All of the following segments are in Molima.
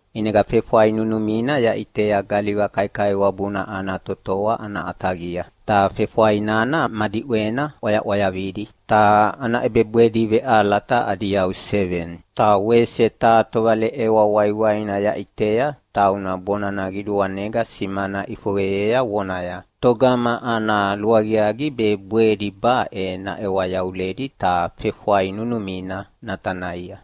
ʼInega fefwai nunumina yaʼitea galiva kaikaiwabuna ana totoa ana ʼataqia, ta fefwai nana ma diʼwena ʼwayaʼwayavidi, ta ana ʼebebwedi veʼalata adi yau seveni. Ta wese taha tovaleʼewa waiwaina yaʼitea tauna bonana qiduanega simana ʼifoqeyea vonaya, “Togama ana luaqiaqi be bwedi baʼe naʼewa yavuledi ta fefwai nunumina natanaia?”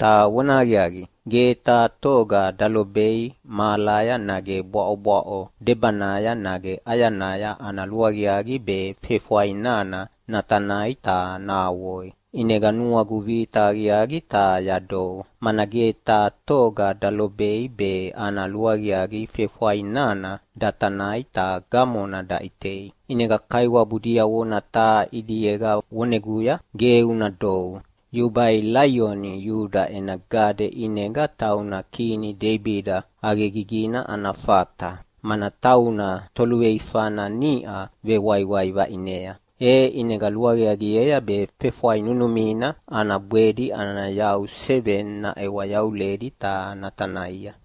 Ta vonahaqiaqi, ge taha toga dalobei mahalaya nage bwaʼobwaʼo debanaya nage ʼayanaya ana luaqiaqi be fefwai nana natanai ta nahavoi. ʼInega nuagu vita aqiaqi ta yadou, mana ge taha toga dalobei be ana luaqiaqi fefwai nana datanai ta gamona daʼitei. ʼInega kaiwabu diavona taha ʼidiega voneguya, “Ge una dou, yubai Laioni Iuda ena gade ʼinega tauna kini Deibida ʼaqegigina ana fata, mana tauna toluveifana niʼa vewaiwai vaʼinea. E ʼinega luaqiaqiea be fefwai nunumina ana bwedi adi yau seveni naʼewa yavuledi ta natanaia.”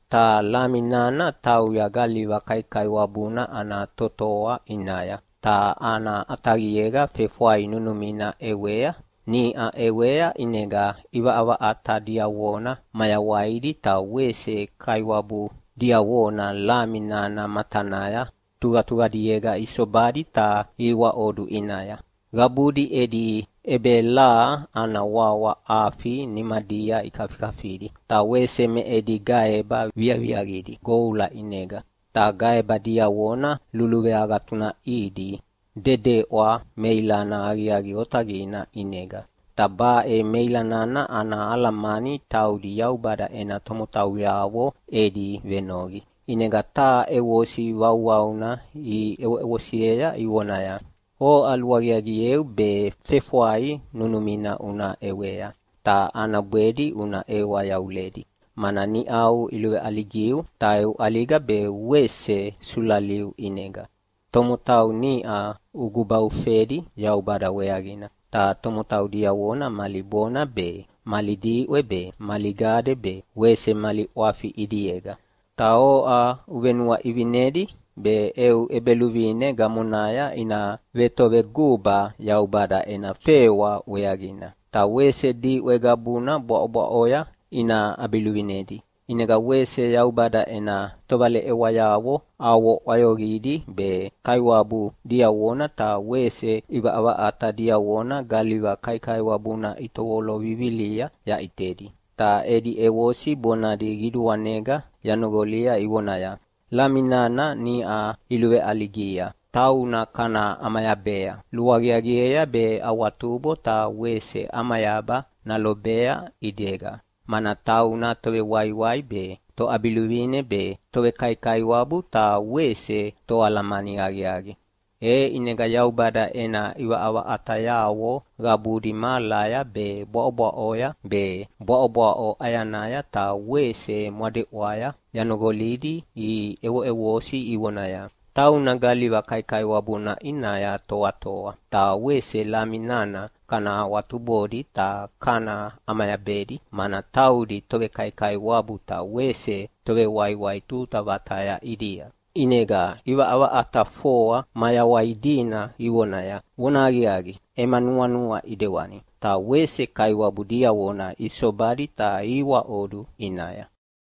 Ta Lami nana tauya galiva kaikaiwabuna ana totoa ʼinaya, ta ana ʼataqiega fefwai nunumina ʼewea. Niʼa ʼewea, ʼinega ʼivaʼavaʼata diavona mayawaidi ta wese kaiwabu diavona Lami nana matanaya tuqatuqadiega isobadi ta ihiwaʼodu ʼinaya. Qabudi edi ʼebelaha ana wawa afi nimadia ikafikafidi, ta wese me edi gaeba viaviaqidi goula ʼinega, ta gaeba diavona luluveagatunaʼidi dedeʼwa meilana aqiaqi otaqina ʼinega. Ta baʼe meilanana ana alamani taudi Yaubada ena tomotauyavo edi venoqi. ʼInega taha ʼevosi vauvauna iʼevosiea ivonaya, “Oʼa luaqiaqieu be fefwai nunumina una ʼewea, ta ana bwedi una ʼewa yavuledi, mana niʼau iluveʼaligiu. Ta eu ʼaliga be wese sulaliu ʼinega, tomotau niʼa ugubaufedi Yaubada weaqina, ta tomotau diavona mali bona be, mali diʼwe be, mali gade be, wese mali ʼwafi ʼidiega. Ta oʼa uvenuaʼivinedi be eu ʼEbeluvine gamonaya ina vetoveguba Yaubada ena fewa weaqina, ta wese diʼwe qabuna bwaʼobwaʼoya ina ʼabiluvinedi.” ʼInega wese Yaubada ena tovaleʼewayavo avo ʼwayoqidi be kaiwabu diavona ta wese ʼivaʼavaʼata diavona galiva kaikaiwabuna itovolo vivilia yaʼitedi, ta edi ʼevosi bonadi qiduanega yanoqolia ivonaya, “Lami nana niʼa iluveʼaligia tauna kana ʼamayabea. Luaqiaqiea be awatubo ta wese ʼamayaba nalobea ʼidega, mana tauna tovewaiwai be, toʼabiluvine be, tovekaikaiwabu ta wese toalamani aqiaqi.” E ʼinega Yaubada ena ʼivaʼavaʼatayavo qabudi mahalaya be, bwaʼobwaʼoya be, bwaʼobwaʼo ʼayanaya ta wese mwadeʼwaya yanoqolidi iʼevoʼevosi ivonaya, “Tauna galiva kaikaiwabuna ʼinaya toatoa ta wese Lami nana kana awatubodi ta kana ʼamayabedi, mana taudi tovekaikaiwabu ta wese tovewaiwai tuta vataya ʼidia.” ʼInega ʼivaʼavaʼata foa mayawai dina ivonaya, “Vonahaqiaqi, ema nuanua ʼidewani.” Ta wese kaiwabu diavona isobadi ta ihiwaʼodu ʼinaya.